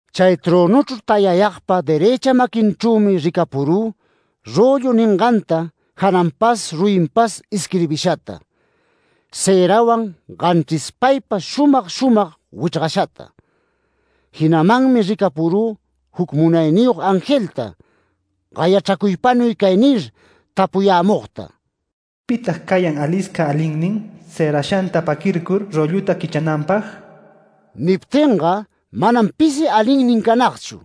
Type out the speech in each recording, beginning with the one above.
Chay trönuchru tayayagpa derëcha maquinchrümi ricapurü röllu ninganta jananpas ruyinpas isquirbishata, cërawan ganchrispaypa shumag shumag wichrgashata. Jinamanmi ricapurü juc munayniyog angelta gayachracuypanuy cay nir tapuyämugta: “¿Pitag cayan alisca alinnin, cërashanta paquircur rölluta quichrananpag?” Niptinga manam pisi alinnin canagchu,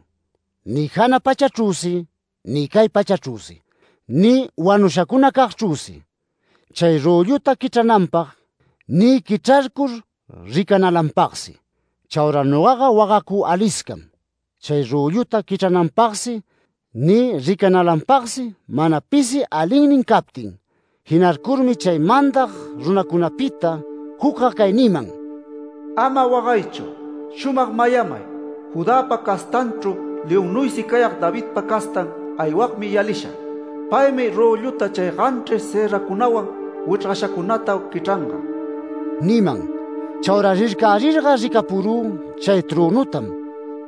ni jana pachachrüsi, ni cay pachachrüsi, ni wanushacunacagchrüsi, chay rölluta quichrananpag, ni quichrarcur ricanalanpagsi. Chaura nogaga wagacü aliscam, chay rölluta quichrananpagsi, ni ricanalanpagsi mana pisi alinnin captin. Jinarcurmi chay mandag runacunapita jucga cay niman: “Ama wagaychu. Shumag mayamay, Judäpa castanchru leonnuysi cayag Davidpa castan aywagmi yalisha. Paymi rölluta chay ganchris cëracunawan wichrgashacunata quichranga” niman. Chaura rircarirga ricapurü chay trönutam,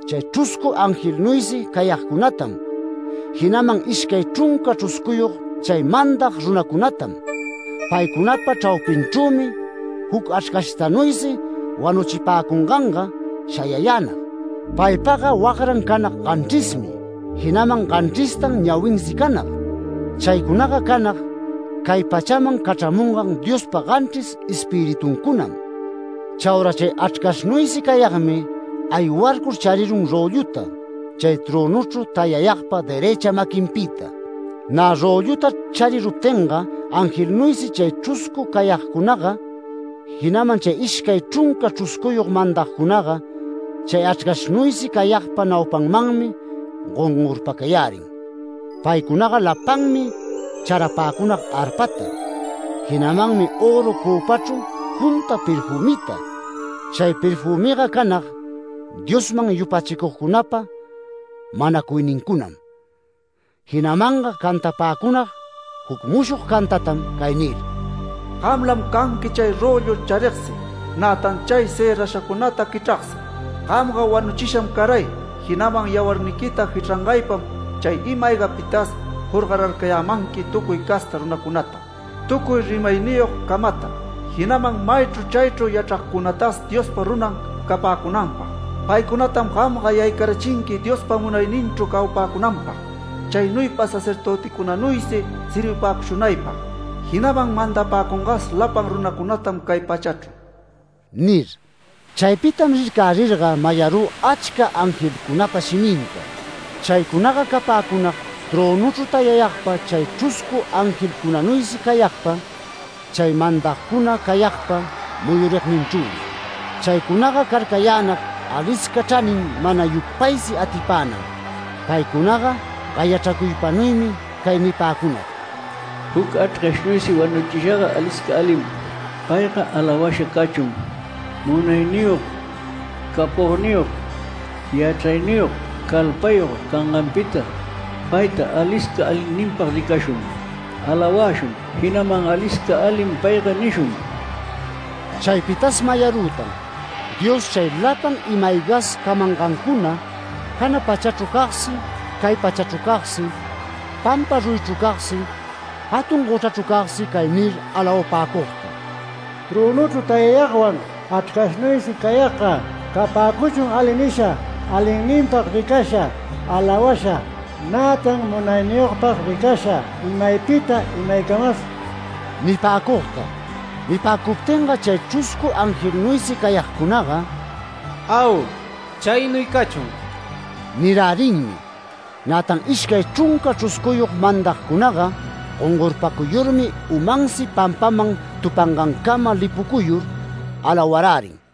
chay chruscu angelnuysi cayagcunatam, jinaman ishcay chrunca chruscuyog chay mandag runacunatam. Paycunapa chraupinchrümi juc Achrcashtanuysi wanuchipäcunganga shayayänag. Paypagga wagran canag ganchrismi, jinaman ganchristan ñawinsi canag. Chaycunaga canag cay pachaman cachramungan Diospa ganchris Espirituncunam. Chaura chay Achrcashnuysi cayagmi aywarcur charirun rölluta chay trönuchru tayayagpa derëcha maquinpita. Nä rölluta chariruptinga, angelnuysi chay chruscu cayagcunaga, jinaman chay ishcay chrunca chruscuyog mandagcunaga, chay Achrcashnuysi cayagpa naupamanmi gongorpacayärin. Paycunaga lapanmi charapäcunag arpata, jinamanmi öru cöpachru junta perfümita. Chay perfümiga canag Diosman yupachicugcunapa manacuynincunam. Jinamanga cantapäcunag juc mushog cantatam cay nir: “Gamlam canqui chay röllu charigsi, nätan chay cërashacunata quichragsi. Gamga wanuchisham caray, jinaman yawarniquita jichrangaypam chay ima-aygapitas jorgararcayämanqui tucuy casta runacunata, tucuy rimayniyog camata, jinaman maychru chaychru yachragcunatas Diospa runan capäcunanpag. Paycunatam gamga yaycarachinqui Diospa munayninchru cawapäcunanpag, chaynuypa sacerdöticunanuysi servipäcushunaypag, jinaman mandapäcungas lapan runacunatam cay pachachru” nir. Chaypitam rircärirga, mayarü achca angelcunapa shiminta. Chaycunaga capäcunag, trönuchru tayayagpa, chay chruscu angelcunanuysi cayagpa, chay mandagcuna cayagpa muyurigninchrümi. Chaycunaga carcayänag alisca chranin mana yupaysi atipänam. Paycunaga gayachracuypanuymi cay nipäcunag: “Juc Achrcashnuysi wanuchishaga alisca alim. Payga alawasha cachun, munayniyog capogniyog yachrayniyog calpayog canganpita. Payta alisca alinninpag ricashun, alawäshun, jinaman ‘Alisca alim payga’ nishun”. Chaypitas mayarütan, Dios chay lapan ima-aygas camangancuna, jana pachachru cagsi, cay pachachru cagsi, pampa ruyichru cagsi, jatun gochrachru cagsi cay nir alawapäcugta: “Trönuchru tayayagwan, Achrcashnuysi cayagga capäcuchun ali nisha, alinninpag ricasha, alawasha, nätan munayniyogpag ricasha imaypita imaycamas” nipäcugta. Nipäcuptinga chay chruscu angelnuysi cayagcunaga “Au, chaynuy cachun” nirärinmi. Nätan ishcay chrunca chruscuyog mandagcunaga gongorpacuyurmi umansi pampaman tupangancama lipucuyur alawarärin.